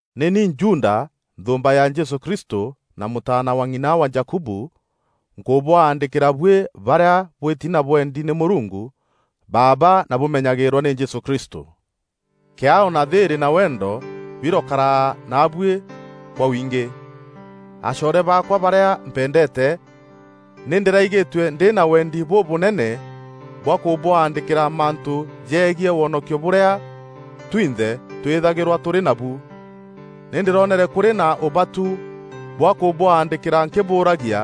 Nî ni Juda, nthûûmba ya Jesû Kristû na mûtaana wa ng'ina wa Jakubu, nkûbwaandîkîra buî barîa bwîti na bwendi nî Mûrungu Baaba na bûmenyagîîrwa nî Jesû Kristû. Kîaao na thîîrî na wendo birokara naabuî kwa wingî. Acoore baakwa barîa mpendeete, nî ndîraigîtue ndî na wendi bûbûnene bwa kûbwaandîkîra mantû jegiî wonokio bûrîa twinthe twîthagîrwa tûrî nabu. Nî ndîronere kûrî na ûbatu bwa kûbwandîkîra nkîbûragia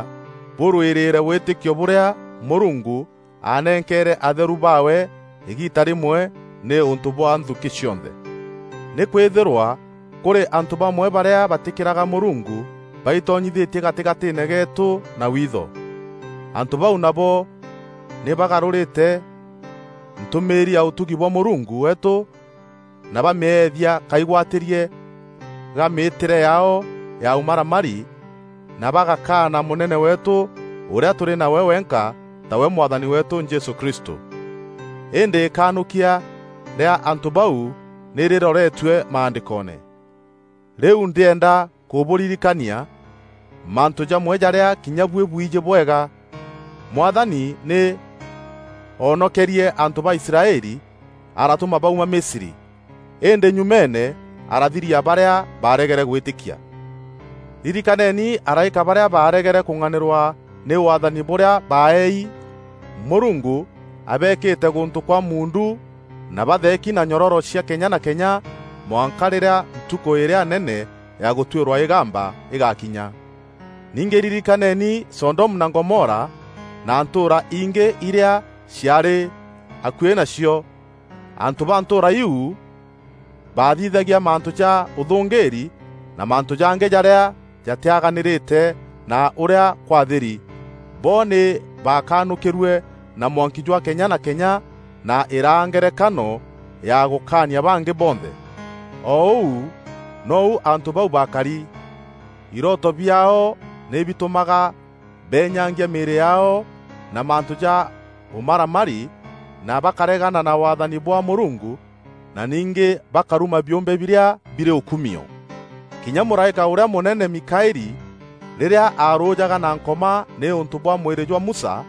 bûrwîrîîre wîtîkio bûrîa Mûrungu aanenkeere atheru baawe îgiita rîmwe nîûntû bwa nthukî cionthe. Nî kwîthîrwaa kûrî antû bamwe barîa batîkîraga Mûrungu baitonyithîtie gatîgatîîne geetû na witho. Antû bau nabo nî bagarûrîte ntûmîîri ya ûtugi bwa Mûrungu weetû na bamîethia kaigwatîrie ga mîîtîre yaao ya ûmaramari na bagakaana Mûnene weetû ûrîa tûrî nawe wenka tawe Mwathani weetû Jesû Kristû. Îndî îkanûkia rîa antû bau nî rîroretue Maandîkoone. Rîu ndîenda kûbûririkania mantû jamwe jarîa kinya buî bwiijî bwega. Mwathani nî oonokerie antû ba Israeli aratûma bauma Misri, îndî nyumeene, arathiria barîa baaregere gwîtîkia. Ririkaneni araîka barîa baaregere kûng'anîrwa nî waathani bûrîa baeei. Mûrungu abeekîte gûntû kwa muundu na batheeki na nyororo cia kenya na kenya mwanka rîrîa Ntukû îrîa nene ya gûtuîrwa îgamba îgakinya. Ningî ririkaneni Sodomu na Gomora na ntûûra ingî irîa ciaarî akuî nacio. Antû ba ntûûra iiu baathithagia mantû ja ûthûngîîri na mantû jangî jarîa jatîaganîrîte na ûrîa kwathîri. Bo nî baakanûkîrue na mwanki jwa kenya na kenya na îraa ngerekano ya gûkaania bangî bonthe. O ûu nou antû bau bakari. Irooto biaao nî bitûmaga beenyangia mîîrî yaao na mantû ja ûmaramari na bakaregana na waathani bwa Mûrungu na ningî bakaruma biûmbe birîa birî ûkumio. Kinya mûraîka ûrîa mûnene, Mikaeli, rîrîa aarûjaga na Nkoma nîûntû bwa mwîrî jwa Musa,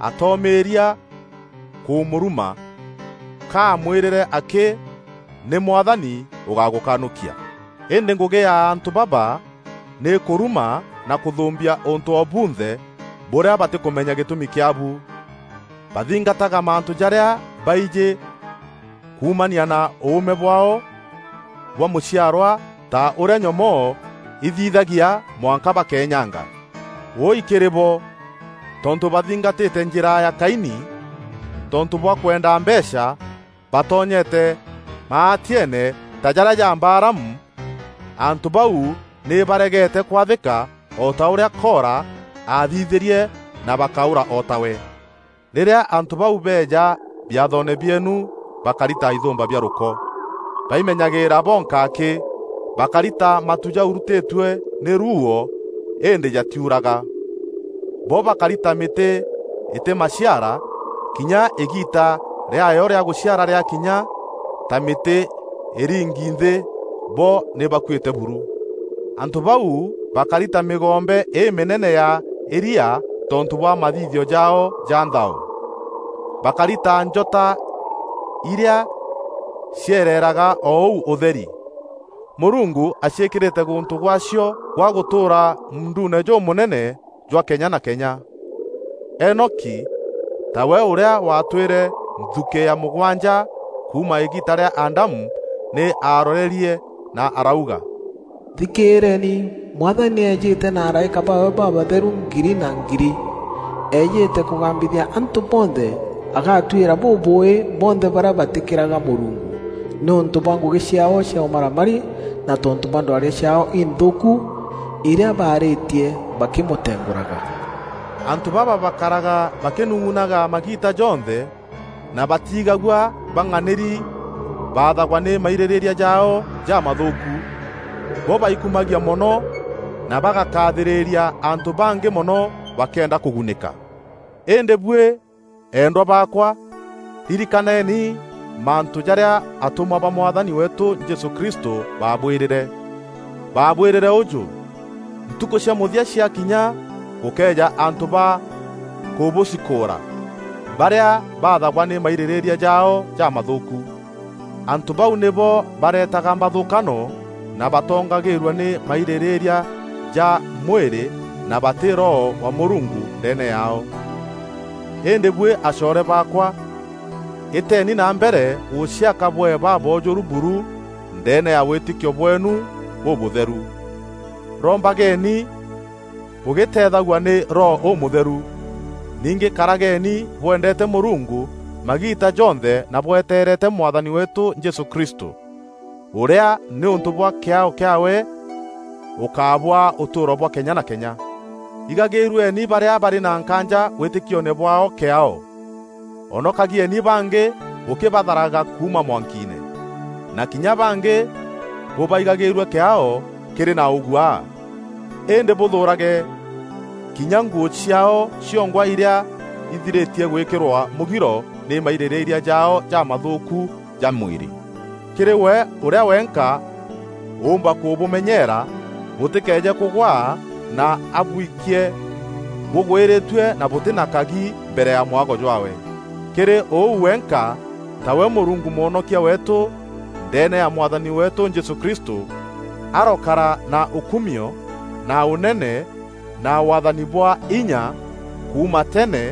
atoomîrîa kûmûruma. Ka aamwîrîre akî: “Nî Mwathani ûgagûkanûkia.” Îndî ngûgî ya antû baba nî kûruma na kûthûmbia ûntû o bunthe bûrîa batîkûmenya gîtûmi kîaabu. Bathingataga mantû jarîa baijî kuumania na ûûme bwaao bwa mûciarwa ta ûrîa nyomoo ithithagia mwanka bakeenyanga. Wûûi kîrî bo! Tontû bathingatîte njîra ya Kaini. Tontû bwa kwenda mbeecha, batonyete maatieene ta jarîa ja Balaamu. Antû bau nî baregete kwathîka o ta ûrîa Kora aathithîrie na bakaûra o tawe. Rîrîa antû bau beeja biathoone bieenu, bakari ta ithûmba bia rûko. Baimenyagîîra bonka akî. Bakari ta matu jaurutîtue nî ruuo îndî jatiuraga. Bo bakari ta mîtî îtî maciara kinya îgiita rîaayo rîa gûciara rîakinya; ta mîtî îringi nthî, bo nî bakuîte buru. Antû bau bakari ta mîgombe îmînene ya îria tontû bwa mathithio jaao ja nthao. Bakari ta njota irîa ciereraga o ûu ûtheri, Mûrungu aciîkîrîte gûntû gwaacio gwa gûtûûra muunduune jûmûnene jwa kenya na kenya. Enoki, tawe ûrîa waatwîre nthukî ya mûgwanja kuuma îgiita rîa Adamu, nî aarorerie na arauga, “Thikîîreni, Mwathani nî eejîte na araîka baawe babatheru ngiri na ngiri, eejîte kûgambithia antû bonthe, agatuîra bûbûûî bonthe barîa batîkîraga Mûrungu nîûntû bwa ngûgî ciaao cia ûmaramari, na tontû bwa ndwaria ciaao inthûûku irîa baarîtie bakîmûtengûraga!” Antû baba bakaraga bakînung'unaga magiita jonthe na batiigagua bang'anîri; baathagwa nî mairîrîîria jaao jamathûûku. Bo baikumagia mono na bagakathîrîria antû bangî mono bakîenda kûgunîka. Îndî buî, eendwa baakwa, ririkaneni mantû jarîa atûmwa ba Mwathani weetû Jesû Kristû baabwîrîre. Baabwîrîre ûjû, “Ntukû cia mûthia ciakinya gûkeeja antû ba kûbûcikûûra, barîa baathagwa nî mairîrîîria jaao jamathûûku.” Antû bau nîbo bareetaga mbathûkano na batongagîîrua nî mairîrîîria ja mwîrî na batî Roho wa Mûrungu ndeene yaao. Îndî buî acoore baakwa, îteni na mbere gûciaka bwee baboojûru buru ndeene ya wîtîkio bweenu bûbûtheru. Rombageni bûgîteethagua nî Roho Ûmûtheru. Ningî karageni bwendeete Mûrungu magiita jonthe na bweteerete Mwathani weetû Jesû Kristû, ûrîa nîûntû bwa kîaao kîaawe ûkabûaa ûtûûro bwa kenya na kenya. Igagîîrueni barîa barî na nkaanja wîtîkioone bwaao kîaao. Onokagieni bangî bûkîbatharaga kuuma mwankiine; na kinya bangî bûbaigîîrue kîaao kîrî na ûguaa, îndî bûthûûrage kinya nguû ciaao ciongwa irîa ithirîtie gwîkîrwa mûgiro nî mairîrîîria jaao jamathûûku ja mwîrî. Kîrî we ûrîa wenka ûûmba kûbûmenyeera bûtîkeeje kûgwaa na abwikie bûgwîrîtue na bûtî na kagi mbere ya mwago jwaawe, kîrî ûu wenka, tawe Mûrungu Mwonokia weetû, ndeene ya Mwathani weetû Jesû Kristû, arokara na ûkumio na ûnene na waathani bwa inya kuuma tene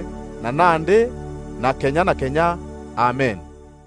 na nandî na kenya na kenya. Amen.